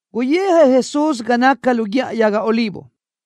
Guyijëʼ Jesús ga naca lu Guíʼa Yaga Olivo.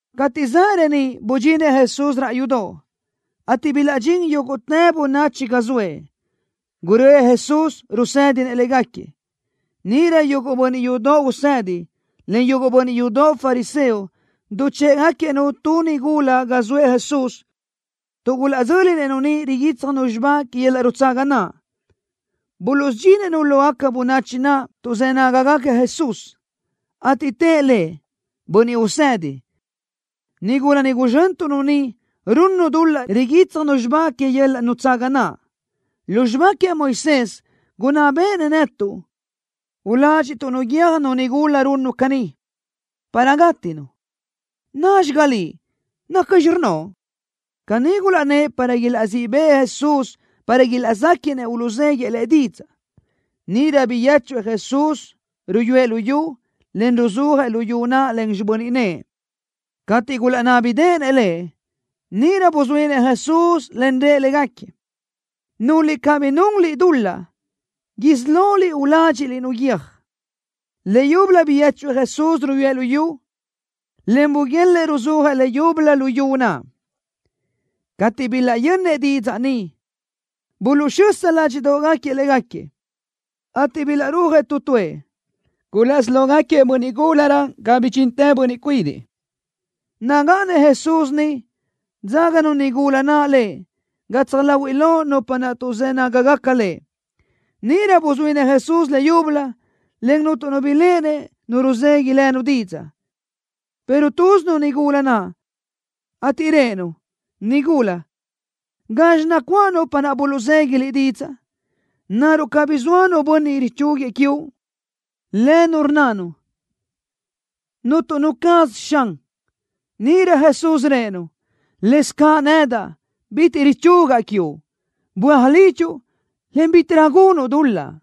Cateʼ zaʼ reníʼ budxinëʼ Jesús raʼ yudoʼ, ateʼ bilaʼdxín yúguʼtë bönachi ga zoëʼ. Guröʼë Jesús, rusédinëʼ légaquiëʼ. Níʼirö yuguʼ bönniʼ yudoʼ usedi, en yuguʼ bönniʼ yudoʼ fariseo duchë́ʼëgaquiëʼ-nu tu nigula ga zoëʼ Jesús, tuʼ gulaʼdzö́linëʼ-nu niʼ riguítsjanu xibá que yöl-laʼ nutsaga naʼ. Buluʼsudxinëʼ-nu lógaca bönachi naʼ tuʼzë́ nágagaca Jesús, ateʼ tëʼ Lëʼ: —Bönniʼ Usedi, nigula ni guzxöntuʼ-nu niʼ runnu dul-laʼ riguítsjanu xibá que yöl-laʼ nutsaga naʼ. Lu xibá queëʼ Moisés, gunná béʼenëʼ netuʼ uládxiʼtuʼ-nu guiö́j nu nigula runnu caní, para gátinu. ¿Názxiga Liʼ, nacxi rnnoʼ? Caní gulaʼnnë́ʼ para ilaʼzíʼ bëʼë Jesús para ilaʼzéquiʼnëʼ uluʼzéguiëʼ Lëʼ didzaʼ. Níʼirö biyéchuëʼ Jesús, ruyúëʼ lu yu, en ruzúajëʼ lu yu naʼ len xibö́n nëʼë. Cateʼ gulaʼnábideʼenëʼ Lëʼ, níʼirö buzuínëʼ Jesús, en rëʼ légaquiëʼ: —Núliʼ cabí nunliʼ dul-laʼ isí loliʼ uládxiʼliʼ-nu guiö́j. Leyúbölö biyéchuëʼ Jesús, ruyúëʼ lu yu, en buguélëʼë ruzúajëʼ leyúbölö lu yu naʼ. Cateʼ bilaʼyönnëʼ didzaʼ ni, buluʼxösa ládxiʼdoʼgaquiëʼ légaquiëʼ, ateʼ bilaʼrúajëʼ tu tuëʼ. Gulaʼsí lógaquiëʼ bönniʼ gúlarö ga bidxintë bönniʼ cuidiʼ. Nagáʼanëʼ Jesús niʼ, dzáganu nigula naʼ Lëʼ gatsaj láhuiʼlö nupa naʼ tuʼzë́ nágagaca Lëʼ. Níʼirö buzuínëʼ Jesús leyúbölö, en cuntu nu biléʼenëʼ nu ruzegui lënu didzaʼ, pero túzinu nigula naʼ, ateʼ rëʼë-nu: —Nigúla, ¿gazxi nacuáʼ nupa naʼ buluʼzegui liʼ didzaʼ? ¿Naruʼ cabí zoa nu bönniʼ richúguiëʼ quiuʼ? Lënu rnnanu: —Cuntu nu caz, Xan. Níʼirö Jesús rëʼë-nu: —Lëzcaʼ nedaʼ, bitiʼ richugaʼ quiuʼ. Böaj lidxuʼ, en bítiʼrö gunuʼ dul-laʼ.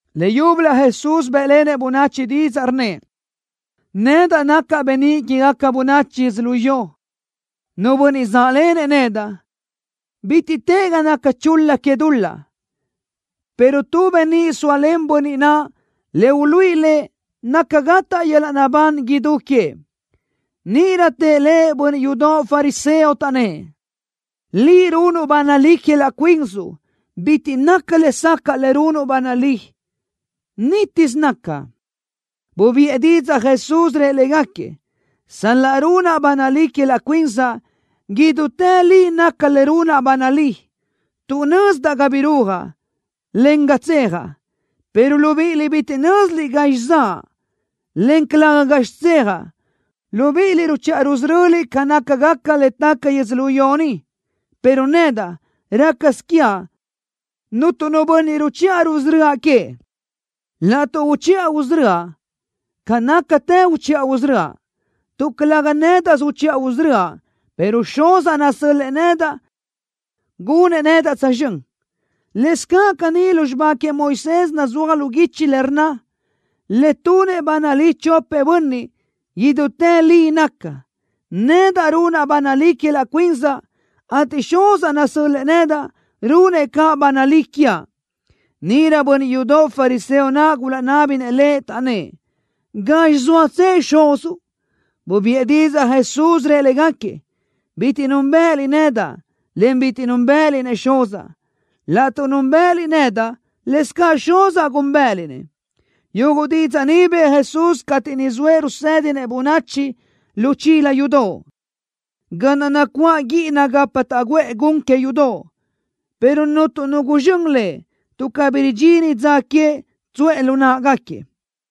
Leyúbölö Jesús bë́ʼlenëʼ bönachi didzaʼ, rnnëʼ: —Nedaʼ nacaʼ beníʼ quégaca bönachi yödzölió. Nu bönniʼ záʼlenëʼ nedaʼ, bitiʼ tëʼ ga naca chul-la que dul-laʼ, pero tu beníʼ sóalen bönniʼ naʼ le uluíʼi lëʼ naca gataʼ yöl-laʼ naʼbán idú queëʼ. Níʼirö tëʼ Lëʼ bönniʼ yudoʼ fariseo, taʼnnë́ʼ: —Liʼ runuʼ ba nalí que laʼ cuinsuʼ. Bitiʼ naca lesacaʼ le runuʼ ba nalí. Nítisö naca. Bubiʼë didzaʼ Jesús, rëʼ légaquiëʼ: —Sal-laʼ runaʼ ba nalí que laʼ cuinsaʼ, idútë li naca le runaʼ ba nalí, tuʼ nözdaʼ ga birúajaʼ, en ga tsejaʼ, pero libíʼiliʼ bitiʼ nö́ziliʼ gazxi zaʼa, en calëga gazxi tsejaʼ. Libíʼiliʼ ruchiʼa rusöröliʼ ca nácagaca le taca yödzölió ni, pero nedaʼ, rácasö quiaʼ cuntu nu bönniʼ ruchiʼa rusörö́aʼ queëʼ. Laʼtuʼ uchiʼa usörö́aʼ, ca nácatë uchiʼa usörö́aʼ, tuʼ calëga nédaʼsö uchiʼa usörö́aʼ, pero Xuzaʼ nasö́l-lëʼë nedaʼ gunëʼ nedaʼ tsözxö́n. Lëscaʼ caní lu xibá queëʼ Moisés nazúaj lu guichi le rnna: Le tunëʼ ba nalí chopëʼ bönniʼ, idútë li naca. Nedaʼ runaʼ ba nalí que laʼ cuinsaʼ, ateʼ Xuzaʼ nasö́l-lëʼë nedaʼ, runëʼ caʼ ba nalí quiaʼ. Níʼirö bönniʼ yudoʼ fariseo naʼ gulaʼnábinëʼ Lëʼ, taʼnnë́ʼ: —¿Gazxi zóatsëʼ Xuzuʼ? Bubiʼë didzaʼ Jesús, rëʼ légaquiëʼ: —Bitiʼ núnbëʼëliʼ nedaʼ, en bitiʼ núnbëʼëliʼ-nëʼ Xuzaʼ. Laʼtuʼ núnbëʼëliʼ nedaʼ, lëscaʼ Xuzaʼ gúnbëʼëliʼ-nëʼ. Yuguʼ didzaʼ ni bëʼë Jesús cateʼ niʼ zoëʼ rusédinëʼ bönachi lu chila yudoʼ, ga naʼ nacuáʼ guíʼina gapa taʼguʼë gun que yudoʼ, pero cuntu nu guzxö́n Lëʼ, tuʼ cabí ridxini dza queëʼ tsuʼë lu náʼagaquiëʼ.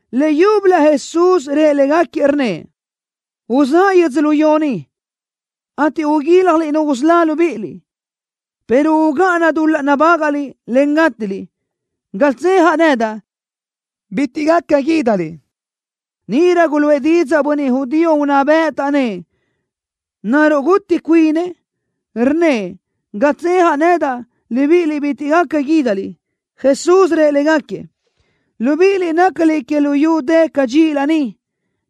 Leyúbölö Jesús rëʼ légaquiëʼ, rnnëʼ: —Uzáʼa yödzölió ni, ateʼ uguíljaliʼ nu usölá libíʼiliʼ, pero ugáʼana dul-laʼ nabágaʼliʼ, en gátiliʼ. Ga tsejaʼ nedaʼ, bitiʼ gaca guídaliʼ. Níʼirö guluʼë didzaʼ bönniʼ judío unná bëʼ, taʼnnë́ʼ: —¿Naruʼ guti cuinëʼ? Rnnëʼ: “Ga tsejaʼ nedaʼ, libíʼiliʼ bitiʼ gaca guídaliʼ.” Jesús rëʼ légaquiëʼ: —Libíʼiliʼ nácaliʼ que luyú dë cadxíʼilö ni,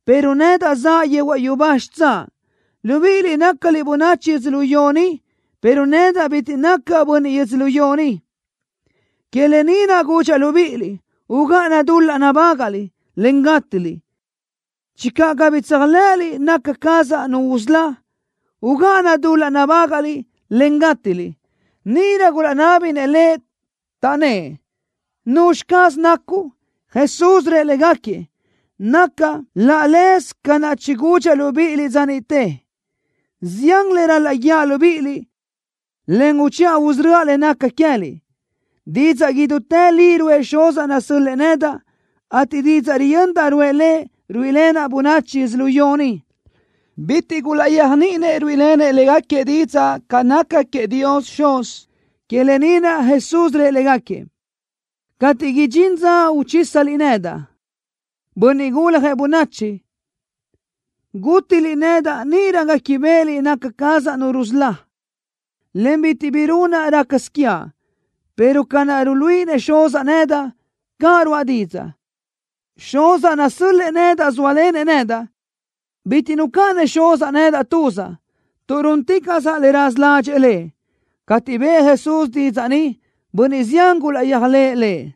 pero nedaʼ zaʼa yehuaʼ yubá xitsáʼ. Libíʼiliʼ nácaliʼ bönachi yödzölió ni, pero nedaʼ bitiʼ nacaʼ bönniʼ yödzölió ni. Que lë ni naʼ gudxaʼ libíʼiliʼ: Ugáʼana dul-laʼ nabágaʼliʼ, en gátiliʼ. Channö cabí tséajlëʼëliʼ naca cazaʼ Nu usölá, ugáʼana dul-laʼ nabágaʼliʼ, en gátiliʼ. Níʼirö gulaʼnábinëʼ Lëʼ, taʼnnë́ʼ: —¿Nuzxi caz nacuʼ? Jesús rëʼ légaquiëʼ: —Nacaʼ laʼ leze ca naʼ chigudxaʼ libíʼiliʼ dza niʼte. Zián le ral-laʼ guíaʼ libíʼiliʼ, en uchiʼa usörö́aʼ le naca queë́liʼ. Didzaʼ idútë li ruʼë Xuzaʼ nasö́l-lëʼë nedaʼ, ateʼ didzaʼ riyöndaʼ ruʼë Lëʼ, ruíʼilenaʼ bönachi yödzölió ni. Bitiʼ gulaʼyéajniʼinëʼ ruíʼilenëʼ légaquiëʼ didzaʼ ca naca queëʼ Dios Xuz. Que lë ni naʼ Jesús rëʼ légaquiëʼ: —Cateʼ idxín dza uchísaliʼ nedaʼ, Bönniʼ Guljëʼ Bönachi, gútiliʼ nedaʼ, níʼirö guéquibeʼeliʼ naca cazaʼ Nu rusölá, en bitiʼ bi runaʼ rácasö quiaʼ, pero ca naʼ ruluíʼinëʼ Xuzaʼ nedaʼ, caʼ ruáʼa didzaʼ. Xuzaʼ nasö́l-lëʼë nedaʼ zóalenëʼ nedaʼ. Bitiʼ nucáʼanëʼ Xuzaʼ nedaʼ tuzaʼ, tuʼ rúnticaʼsaʼ le raza ládxëʼë Lëʼ. Cateʼ bëʼë Jesús didzaʼ ni, bönniʼ zián gulaʼyéajlëʼë Lëʼ.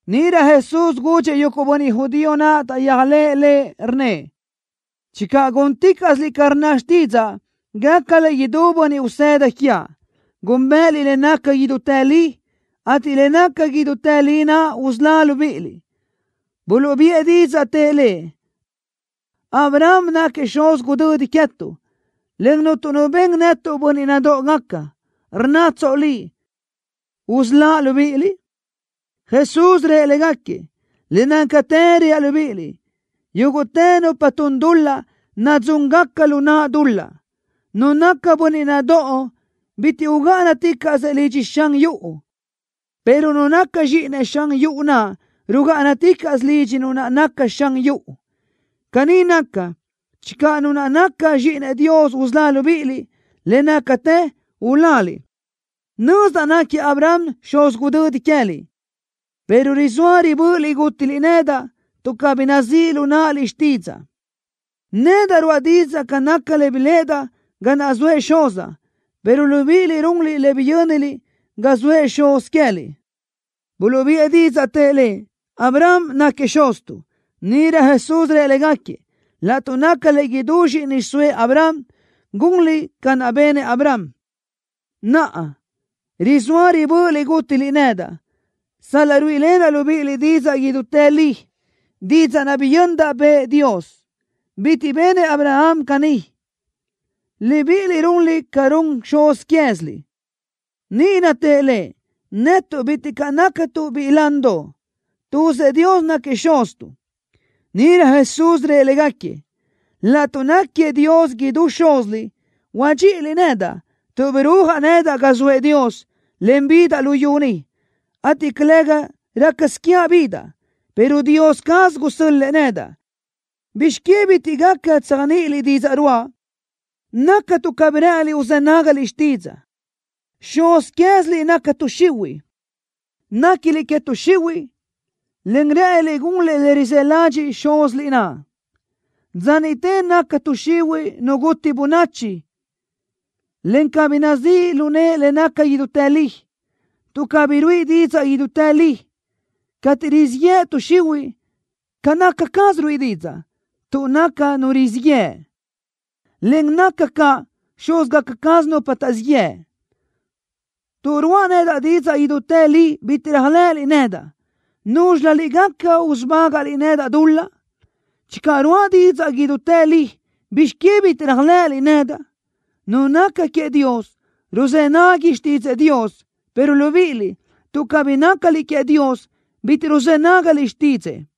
Níʼirö Jesús gudxëʼ yuguʼ bönniʼ judío naʼ taʼyéajlëʼë Lëʼ, rnnëʼ: —Channö gúnticaʼsiliʼ ca rnna xtídzaʼa, gácaliʼ idú bönniʼ usëda quiaʼ. Gúnbëʼëliʼ le naca idútë li, ateʼ le naca idútë li naʼ usölá libíʼiliʼ. Buluʼbiʼë didzaʼ, tëʼ Lëʼ: —Abraham naquiëʼ xuz gudödi queëtuʼ, en cuntu nu ben netuʼ bönniʼ nadóʼogaca. ¿Rnnatsoʼ: “Usölá libíʼiliʼ”? Jesús rëʼ légaquiëʼ: —Le nácatë reaʼ libíʼiliʼ: Yúguʼtë nupa tun dul-laʼ, nadzúngaca lu naʼ dul-laʼ. Nu naca bönniʼ nadóʼo bitiʼ ugáʼanaticaʼsö lidxëʼ xan yuʼu, pero nu naca zxíʼinëʼ xan yuʼu naʼ rugáʼanaticaʼsö lidxi nu naʼ naca xan yuʼu. Caní naca, channö Nu naʼ naca Zxíʼinëʼ Dios usölá libíʼiliʼ, le nácatë uláliʼ. Nözdaʼ naquiëʼ Abraham xuz gudödi queëliʼ, pero rizóa ribö́ʼöliʼ gútiliʼ nedaʼ, tuʼ cabí nazíʼ lu náʼaliʼ xtídzaʼa. Nedaʼ ruáʼa didzaʼ ca naca le biléʼedaʼ ga naʼ zoëʼ Xuzaʼ, pero libíʼiliʼ runliʼ le biyö́niliʼ ga zoa xuz quéziliʼ. Buluʼbiʼë didzaʼ, tëʼ Lëʼ: —Abraham náquiëʼ xuztuʼ. Níʼirö Jesús rëʼ légaquiëʼ: —Laʼtuʼ nácaliʼ idú zxíʼini xiʼsóëʼ Abraham, gunliʼ ca naʼ benëʼ Abraham. Naʼa, rizóa ribö́ʼöliʼ gútiliʼ nedaʼ, sal-laʼ ruíʼilenaʼ libíʼiliʼ didzaʼ idútë li, didzaʼ naʼ biyöndaʼ bëʼë Dios. Bitiʼ benëʼ Abraham caní. Libíʼiliʼ runliʼ ca run xuz quéziliʼ. Níʼirö tëʼ Lëʼ: —Netuʼ bitiʼ caʼ nácatuʼ biʼi landoʼ. Tuzëʼ Dios náquiëʼ Xuztuʼ. Níʼirö Jesús rëʼ légaquiëʼ: —Laʼtuʼ náquiëʼ Dios idú Xúziliʼ, huadxíʼiliʼ nedaʼ, tuʼ birúajaʼ nedaʼ ga zoëʼ Dios, en bidaʼ luyú ni, ateʼ calëga rácasö quiaʼ bidaʼ, pero Dios caz gusö́l-lëʼë nedaʼ. ¿Bizx que bitiʼ gaca tséajniʼiliʼ didzaʼ ruáʼa? Naca tuʼ cabí rë́ʼëniliʼ uzë́ nágaliʼ xtídzaʼa. Xuz quéziliʼ naca tuʼ xihuiʼ. Néquiliʼ que tuʼ xihuiʼ, en rë́ʼëniliʼ gunliʼ le rizë́ ladxiʼ xúziliʼ naʼ. Dza niʼte naca tuʼ xihuiʼ nu guti bönachi, en cabí nazíʼ lu nëʼe le naca idútë li, tuʼ cabí ruíʼi didzaʼ idútë li. Cateʼ rizíʼ yëʼ tuʼ xihuiʼ, ca naca caz ruíʼi didzaʼ, tuʼ naca nu rizíʼ yëʼ, en naca ca xúzgaca caz nupa taʼzíʼ yëʼ. Tuʼ ruáʼa nedaʼ didzaʼ idútë li bitiʼ réajlëʼëliʼ nedaʼ. ¿Núzxilöliʼ gaca usubágaʼliʼ nedaʼ dul-laʼ? Channö ruáʼa didzaʼ idútë li, ¿bizx que bitiʼ réajlëʼëliʼ nedaʼ? Nu naca queëʼ Dios, ruzë́ nagui xtídzëʼë Dios, pero libíʼiliʼ, tuʼ cabí nácaliʼ queëʼ Dios, bitiʼ ruzë́ nágaliʼ xtídzëʼë.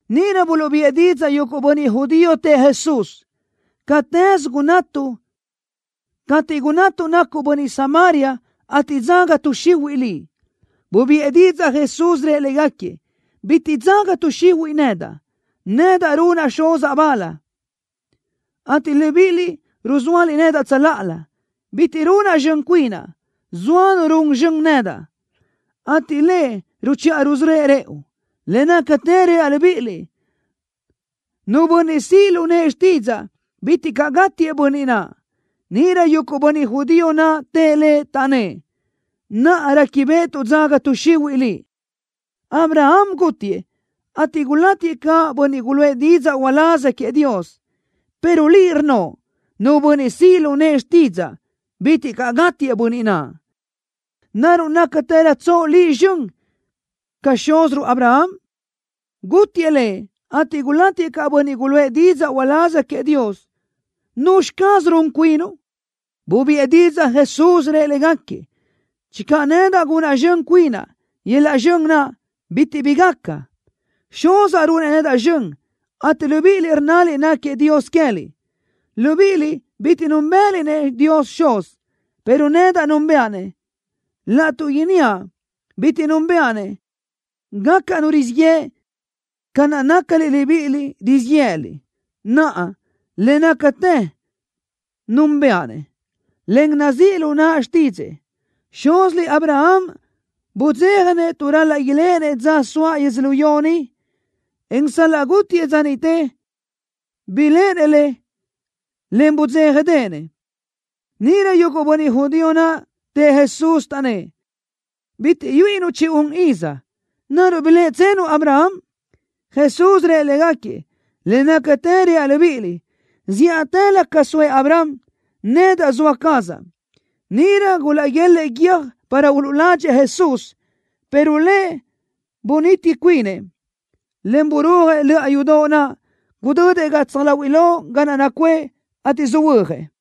Níʼirö buluʼbiʼë didzaʼ yuguʼ bönniʼ judío, tëʼ Jesús: —Catëz gunnatuʼ cateʼ gunnatuʼ nacuʼ bönniʼ Samaria, ateʼ dzaga tuʼ xihuiʼ Liʼ. Bubiʼë didzaʼ Jesús, rëʼ légaquiëʼ: —Bitiʼ dzaga tuʼ xihuiʼ nedaʼ. Nedaʼ runaʼ Xuzaʼ bal, ateʼ libíʼiliʼ ruzóaliʼ nedaʼ tsöláʼalö. Bitiʼ runaʼ zxön cuinaʼ. Zoa Nu run zxön nedaʼ, ateʼ Lëʼ ruchiʼa rusörö́ëʼ rëʼu. Le nácatë reaʼ libíʼiliʼ: Nu bönniʼ siʼ lu nëʼë xtídzaʼa, bitiʼ caʼ gátiëʼ bönniʼ naʼ. Níʼirö yuguʼ bönniʼ judío naʼ tëʼ Lëʼ, taʼnnë́ʼ: —Naʼa réquibeʼetuʼ dzaga tuʼ xihuiʼ Liʼ. Abraham gútiëʼ, ateʼ gulátiëʼ caʼ bönniʼ guluʼë didzaʼ uláz queëʼ Dios, pero Liʼ rnnoʼ: “Nu bönniʼ siʼ lu nëʼë xtídzaʼa, bitiʼ caʼ gátiëʼ bönniʼ naʼ.” ¿Naruʼ nácatërötsoʼ Liʼ zxön ca xúziruʼ Abraham? Gútiëʼ lëʼ, ateʼ gulátiëʼ caʼ bönniʼ guluʼë didzaʼ uláz queëʼ Dios. ¿Nuzxi caz run cuinuʼ? Bubiʼë didzaʼ Jesús, rëʼ légaquiëʼ: —Channö nedaʼ gunaʼ zxön cuinaʼ, yöl-laʼ zxön naʼ bitiʼ bi gaca. Xuzaʼ runëʼ nedaʼ zxön, ateʼ libíʼiliʼ rnnaliʼ náquiëʼ Dios queë́liʼ. Libíʼiliʼ bitiʼ núnbëʼëliʼ-nëʼ Dios Xuz, pero nedaʼ núnbëʼa-nëʼ. Laʼtuʼ inníaʼ: Bitiʼ núnbëʼa-nëʼ, gacaʼ nu rizíʼ yëʼ ca naʼ nácaliʼ libíʼiliʼ, rizíʼ yë́ʼëliʼ. Naʼa, le nácatë núnbëʼa-nëʼ, en nazíʼ lu naʼa xtídzëʼë. Xúziliʼ Abraham budzéjanëʼ tuʼ ral-laʼ iléʼenëʼ dza soaʼ yödzölió ni, en sal-laʼ gútiëʼ dza niʼte, biléʼenëʼ le, en budzéjadeʼenëʼ. Níʼirö yuguʼ bönniʼ judío naʼ tëʼ Jesús, taʼnnë́ʼ: —Bitiʼ yuíʼinuʼ chi-un iz. ¿Naruʼ biléʼetsenuʼ Abraham? Jesús rëʼ légaquiëʼ: —Le nácatë reaʼ libíʼiliʼ: Zíʼatëlö ca soëʼ Abraham, nedaʼ zoa cazaʼ. Níʼirö gulaʼguélëʼë guiö́j para uluʼladxëʼ Jesús, pero Lëʼ bunítitë cuinëʼ, en burúajëʼ löʼa yudoʼ naʼ. Gudödëʼ gatsaj láhuiʼlö ga naʼ nacuʼë, ateʼ söhuö́jëʼ.